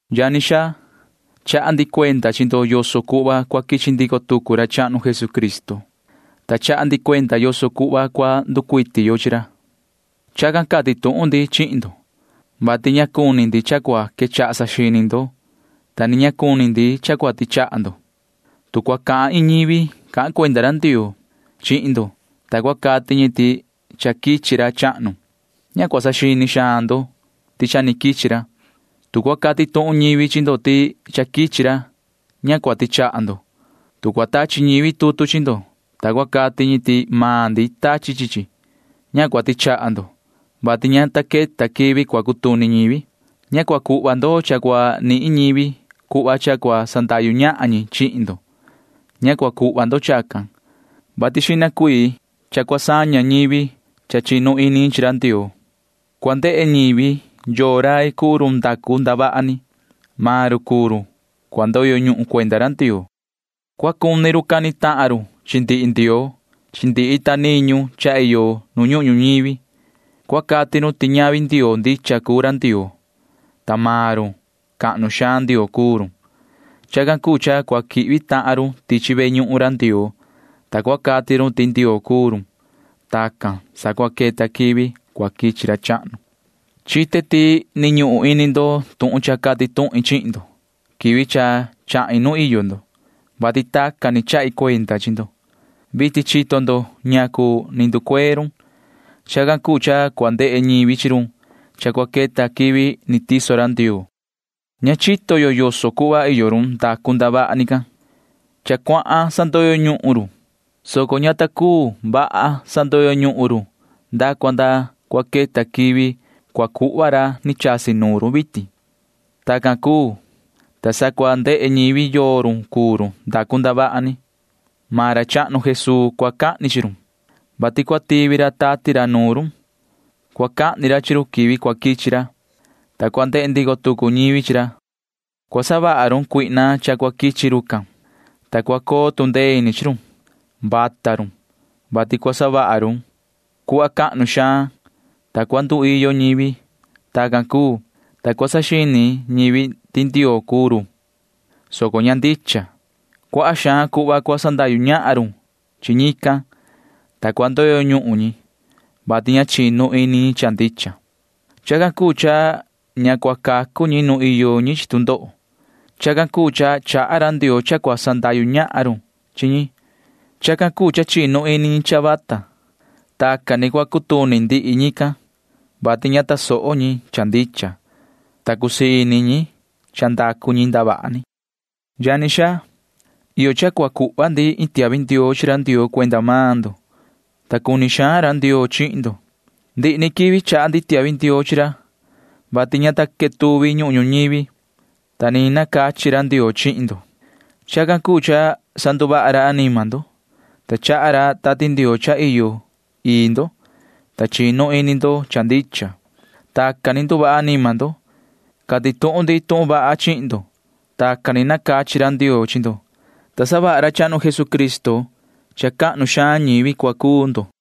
Yani xaa, chaha ndi cuenda chi ndo yoso cuhva cua quichi ndico tucu ra chahnu Jesucristo, ta chaha ndi cuenda yoso cuhva cua nducuiti yo chi ra. Chacan cati tuhun ndi chihin ndo, vati ña cuni ndi cha cua quechaha saxini ndo, ta ni ña cuni ndi cha cua tichaha ndo ni suhva. Tu cua cahan iin ñivi cahan cuenda ra Ndioo chihin ndo, ta cua cati ñi ti cha quichi ra chahnu, ña cua saxini xaan ndo ti cha ni quichi ra. Tu cua cati tuhun cachin ñivi chi ndo ti cha quichi ra, ña cua tichaha ndo. Tu cua tachi ñivi tutu chi ndo, ta cua cati ñi ti maan ndi tachi chi chi, ña cua tichaha ndo, vati ña ta queta quivi cua cutuni ñivi. Ña cua cuhva ndo cha cua nihin ñivi cuhva cha cua sandahyu ñahan ñi chihin ndo. Ña cua cuhva ndo chacan, vati xihna cuii cua saña ñivi cha chinu ini ñi chi ra Ndioo, ta cua ndehe ñivi yoo rai cuu run ndacu ndavaha ni. Maan run cuu run cua ndoyo ñuhun cuenda ra Ndioo. Cua cuni cani tahan run chi ndihi ndioo chi ndihi ita niñu cha iyo nu ñuhun ñuñivi. [Cua cati run ti ñavi ndioo ndicha cuu ra Ndioo, soco maan run―cahnu xaan ndioo cuu run.] Chacan cuu cha cua quihvi tahan run tichi ve ñuhun ra Ndioo, ta cua cati run ti Ndioo cuu run. [Tacan, ta sa cua queta quivi cua quichi ra chahnu.] Chite ti ni ñuhun ini ndo tuhun cha cati tuhin chihin ndo quivi cha chahin nu iyo ndo, vati tacan ni chahi cuenda chi ndo. Vitin chito ndo ñacu ni nducuee run. Chacan cuu cha cua ndehe ñivi chi run cha cua queta quivi ni tiso ra Ndioo. Ña chito yo yoso cuhva iyo run ndacu ndavaha ni can. Cha cuahan sandoyo ñuhun run, soco ña ta cuu vaha sandoyo ñuhun run nda cua nda cua queta quivi cua cuhva ra ni chasi nuun run vitin. Tacan cuu, ta sa cua ndehe ñivi yoo run cuu run ndacu ndavaha ni. Maan ra chahnu Jesuu cua cahni chi run, vati cua tivi ra tati ra nuun run. Cua cahni ra chi run quivi cua quichi ra, ta cua ndehe ndico tucu ñivi chi ra. Cua savaha run Satanaa cha cua quichi rucan, ta cua coo tu ndee ini chi run. Vata run, vati cua savaha run cuhva cahnu xaan, ta cua nduiyo ñivi. Tacan cuu, ta cua saxini ñivi ti Ndioo cuu run, soco ña ndicha. Chi ndihi cuii cuhva cua sandahyu ñahan run chi ñican, ta cua ndoyo ñuhun ñi, vati ña chinu ini ñi cha ndicha. Chacan cuu cha ña cua cacu ñi nu iyo ñi chi tu ndoho. Chacan cuu cha chaha ra Ndioo cha cua sandahyu ñahan run chi ñi. Chacan cuu cha chinu ini ñi cha vata. Tacan ni cua cutuni ndihi ñican, vati ña tasoho ñi cha ndicha, ta cusii ini ñi cha ndacu ñi ndavaha ni. Yani xaa, iyo cha cua cuhva ndi iin tiahvi ndioo chi ra Ndioo cuenda maan ndo, ta cuni xaan ra Ndioo chihin ndo. Ndihi ni quivi chaha ndi tiahvi ndioo chi ra, vati ña ta quetuvi ñuhun ñuñivi, ta ni nacachi ra Ndioo chihin ndo. Chacan cuu cha sanduvaha ra anima ndo, ta chaha ra Tati Ndioo cha iyo ii ndo, ta chinu ini ndo cha ndicha. Tacan ni nduvaha anima ndo. Cati tuhun ndi tuhun vaha chihin ndo. Tacan ni nacachi ra Ndioo chi ndo, ta savaha ra chahnu Jesucristo cha ñivi cahnu xaan cua cuu ndo.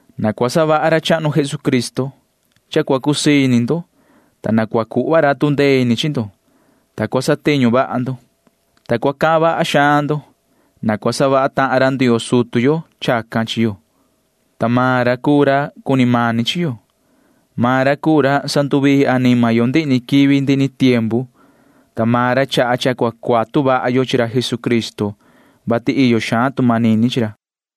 Na cua savaha ra chahnu Jesucristo cha cua cusii ini ndo. Na cua cuhva ra tu ndee ini chi ndo, ta cua satiñu vaha ndo, ta cua cahan vaha xaan ndo. Na cua savaha tahan ra Ndioo sutu yo chacan chi yo, ta maan ra cuu ra cuni mani chi yo. Maan ra cuu ra sanduvii anima yo ndihi ni quivi ndihi ni tiempu, ta maan ra chaha cha cua cuatu vaha yo chi ra Jesucristo, vati iyo xaan tu manini chi ra.